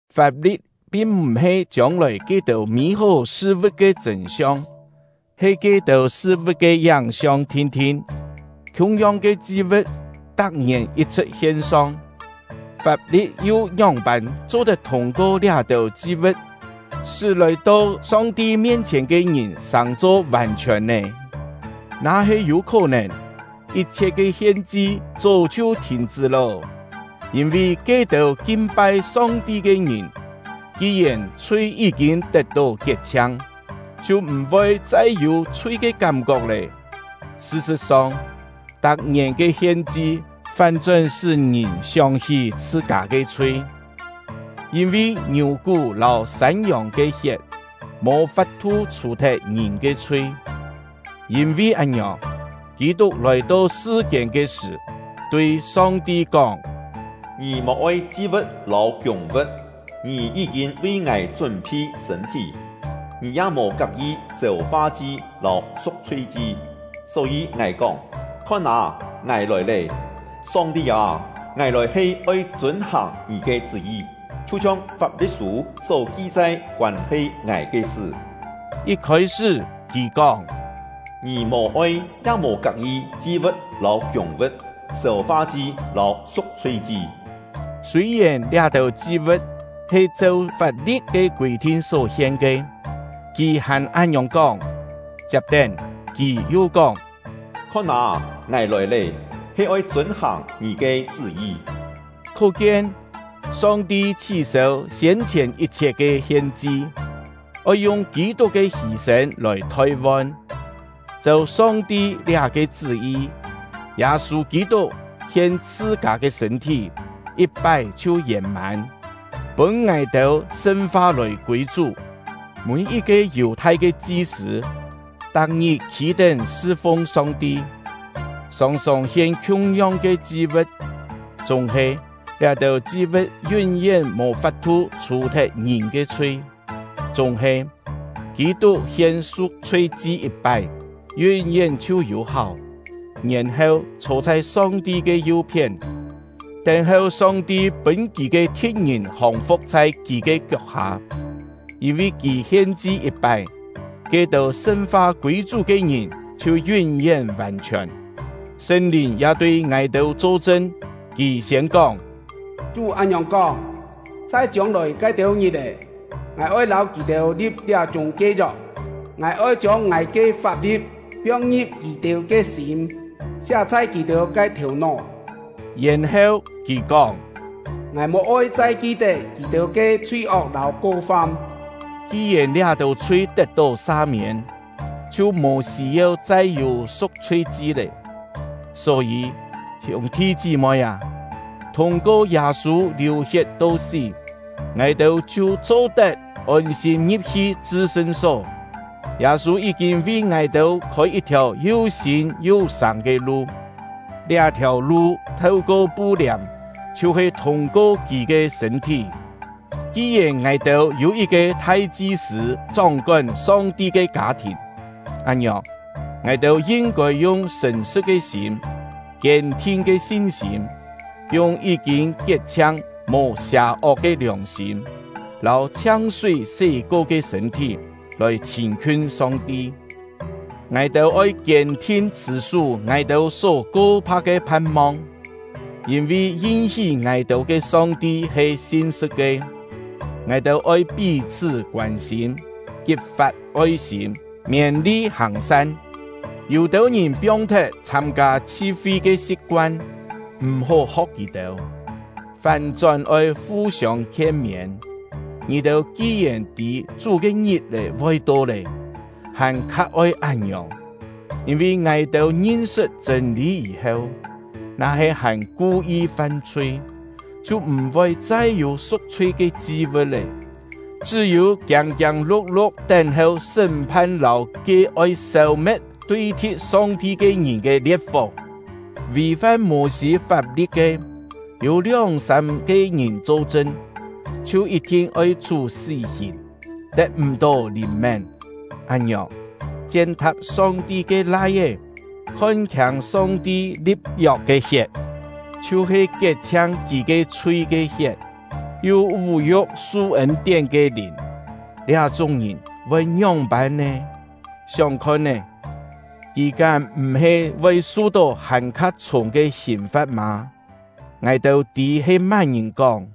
Fap-li̍t pin m̀-he chiông-lòi ke-têu mî-hó sṳ-vu̍t ke chṳ̂n-siong, he ke-têu sṳ-vu̍t ke yáng-siong thin-thin. Khiung-yong ke chi-vu̍t tak-ngièn yit-chhṳ̍t hien-song, fap-li̍t yu ngióng-pân cho-tet thûng-ko liá-têu chi-vu̍t sṳ́ lòi-to Song-ti mien-chhièn ke ngìn sàng-cho vàn-chhiòn nè? Na-he yû khó-nèn, yit-chhiet ke hien-chi chó chhiu thìn-chṳ́ lô! Yîn-vi ke-têu kin-pai Song-ti ke ngìn, ki-yèn chhui yí-kîn tet-tó kiet-chhiang, chhiu m̀-voi chai yû chhui ke kám-kok lé. Sṳ-sṳ̍t-song, tak-ngièn ke hien-chi fán-chón sṳ́ ngìn sióng-hí chhṳ-kâ ke chhui, yîn-vi ngiù-kú lâu sân-yòng ke hiet mò fap-thu chhù-thet ngìn ke chhui. Yîn-vi án-ngiòng, Kî-tuk lòi-to sṳ-kiên ke sṳ̀, tui Song-ti kóng: Ngì mò-oi chi-vu̍t lâu kiûng-vu̍t; Ngì yí-kîn vi ngài chún-phi sṳ̂n-thí. Ngì ya mò kak-yi sêu-fa-chi lâu su̍k-chhui-chi. Só-yî ngài kóng: Khon â, ngài lòi lé! Song-ti â, ngài lòi he oi chûn-hàng Ngì ke chṳ́-yi, chhiu-chhiong Fap-li̍t-sû só ki-chai koân-he ngài ke sṳ. Yit khôi-sṳ́, kì kóng: “Ngì mò-oi, ya mò kak-yi chi-vu̍t lâu kiûng-vu̍t, sêu-fa-chi lâu su̍k-chhui-chi.” Sûi-yèn liá-têu chi-vu̍t he cheu fap-li̍t ke kûi-thin só-hien ke, kì hàn án-ngiòng kóng. Chiap-tén, kì yu kóng: “Khon â, ngài lòi lé, he oi chûn-hàng Ngì ke chṳ́-yi.” Khó-kien, Song-ti chhí-sêu siên-chhièn yit-chhiet ke hien-chi, oi yung Kî-tuk ke hî-sên lòi thoi-von. Cheu Song-ti liá-ke chṳ́-yi, Yâ-sû Kî-tuk hien chhṳ-kâ ke sṳ̂n-thí, yit-pái chhiu yèn-mân, pûn ngài-têu sṳn-fa lòi kûi Chú. Mî-yit-ke Yù-thai ke chi-sṳ̂ tak-ngit khî-tén sṳ-fung Song-ti, sòng-sòng hien khiung-yong ke chi-vu̍t; chúng-he liá-têu chi-vu̍t yún-yén mò fap-thu chhù-thet ngìn ke chhui. Chúng-he, Kî-tuk hien su̍k-chhui-chi yit-pái, yún-yén chhiu yû-háu, yèn-heu chhô chhai Song-ti ke yu-phién, tén-heu Song-ti pûn kì ke thi̍t-ngìn hòng-fu̍k chhai kì ke kiok-hâ. Yîn-vi kì hien-chi yit-pái, ke-têu sṳn-fa kûi Chú ke ngìn chhiu yún-yén vàn-chhiòn. Sṳn-Lìn ya tui ngài-têu cho-chṳn; Kì siên kóng: Chú án-ngiòng kóng: Chhai chiông-lòi ke-têu ngit-è, Ngài oi lâu kì-têu li̍p liá-chúng ke yok: Ngài oi chiông Ngài ke fap-li̍t piong-ngi̍p kì-têu ke sîm, siá chhai kì-têu ke thèu-nó. Yèn-heu, Kì kóng: “Ngài mò-oi chai ki-tet kì-têu ke chhui-ok lâu ko-fam.” Ki-yèn liá-têu chhui tet-tó sa-miên, chhiu mò sî-yeu chai yû su̍k-chhui-chi lé. Só-yî, hiûng-thi chí-moi â, thûng-ko Yâ-sû liù-hiet to sí, ngài-têu chhiu cho-tet ôn-sîm ngi̍p-hi chṳ-sṳn-só. Yâ-sû yí-kîn vi ngài-têu khôi yit-thiàu yu sîn yu sâng ke lu; liá-thiàu lu theu-ko pu-liàm, chhiu-he thûng-ko kì ke sṳ̂n-thí. Ki-yèn ngài-têu yû yit-ke thai-chi-sṳ̂ chóng-kón Song-ti ke kâ-thìn, án-ngiòng, ngài-têu yin-kôi yung sṳ̀n-sṳ̍t ke sîm, kiên-thin ke sin-sîm, yung yí-kîn kiet-chhiang, mò sià-ok ke liòng-sîm, lâu chhiang-súi sé-ko ke sṳ̂n-thí, lòi chhîn-khiun Song-ti. Ngài-têu oi kiên-thin chhṳ̀-sú ngài-têu só ko-pha̍k ke phan-mong, yîn-vi yin-hí ngài-têu ke Song-ti he sin-sṳ̍t ke. Ngài-têu oi pí-chhṳ́ koân-sîm, kit-fat oi-sîm, miên-li hàng-san. Yû-têu ngìn piong-thet chhâm-kâ chhi-fi ke si̍p-koan; m̀-hó ho̍k kì-têu, fán-chón oi fu-siông khien-miên. Ngì-têu ki-yèn tî Chú ke ngit-è voi to lé, hàn-kha oi án-ngiòng. Yîn-vi ngài-têu ngin-sṳt chṳ̂n-lî yî-heu, na-he hàn ku-yi fam-chhui, chhiu m̀-voi chai yû su̍k-chhui ke chi-vu̍t lé; chṳ́-yû kiâng-kiâng lu̍k-lu̍k tén-heu sṳ́m-phan lâu ke oi sêu-me̍t tui-thi̍t Song-ti ke ngìn ke lie̍t-fó! Vì-fam Mô-sî fap-li̍t ke, yû lióng-sâm-ke ngìn cho-chṳn, chhiu yit-thin oi chhú sí-hìn, tet m̀-tó lìn-mén. Án-ngiòng, chien-tha̍p Song-ti ke Lai-é, khon-khiâng Song-ti li̍p-yok ke hiet — chhiu-he kiet-chhiang kì ke chhui ke hiet, yu vú-yu̍k su ên-tién ke Lìn, liá-chúng ngìn voi ngióng-pân nè? Sióng khon-é, kì kám m̀-he voi su-tó hàn-kha chhûng ke hìn-fa̍t mâ? Ngài-têu tî he má-ngìn kóng: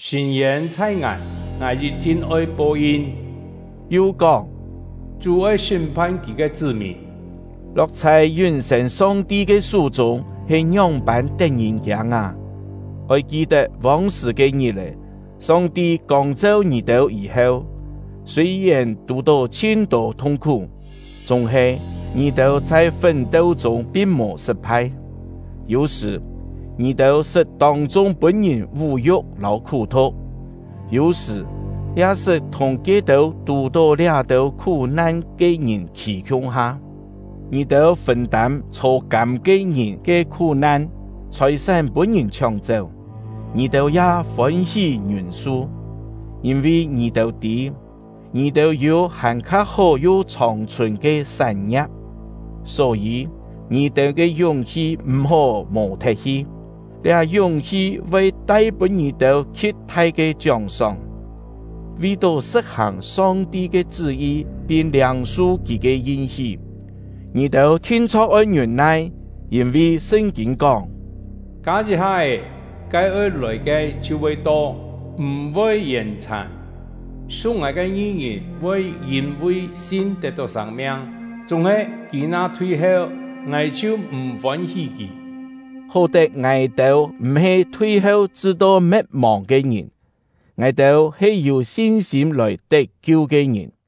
“Sṳ̂n-yên chhai Ngài, Ngài yit-thin oi po-yin”; yu kóng: “Chú oi sṳ́m-phan Kì ke chṳ́-mìn.” Lo̍k chhai yún-sên Song-ti ke sú-chûng he ngióng-pân tet-ngìn-kiâng â! Oi ki-tet vông-sṳ̀ ke ngit-è. Song-ti kông-cheu ngì-têu yî-heu, sûi-yèn tù-tó chhin-tô thung-khú, chúng-he ngì-têu chhai fún-teu-chûng pin mò sṳt-phai. Yû-sṳ̀, ngì-têu sṳt tông-chung pûn-ngìn vú-yu̍k lâu khú-thu̍k; yû-sṳ̀, ya sṳt thùng ke-têu tù-tó liá-têu khú-nan ke ngìn khî khiung-ha. Ngì-têu fûn-tâm chhô-kâm ke ngìn ke khú-nan. Chhòi-sán pûn-ngìn chhióng-chéu, ngì-têu ya fôn-hí ngiûn-su; yîn-vi ngì-têu tî, ngì-têu yû hàn-kha hó yu chhòng-chhùn ke sán-ngia̍p. Só-yî, ngì-têu ke yúng-hi m̀-hó mò-thet-hi; liá yúng-hi voi tai pûn ngì-têu khi̍t-thai ke chióng-sóng. Vi-tó sṳ̍t-hàng Song-ti ke chṳ́-yi pin liâng-su Kì ke yin-hí, ngì-têu thin-chho̍k oi ngiûn-nai. Yîn-vi Sṳn-kîn kóng: Kâ yit-ha-é, ke oi lòi ke chhiu voi to, m̀-voi yèn-chhàn. Su̍k Ngài ke ngi-ngìn voi yîn-vi sin tet-tó sâng-miang. Chúng-he, kì na thui-heu, Ngài chhiu m̀ fôn-hí kì. Hó-tet ngài-têu m̀-he thui-heu chṳ-to me̍t-mòng ke ngìn; ngài-têu he yû sin-sîm lòi tet-kiu ke ngìn.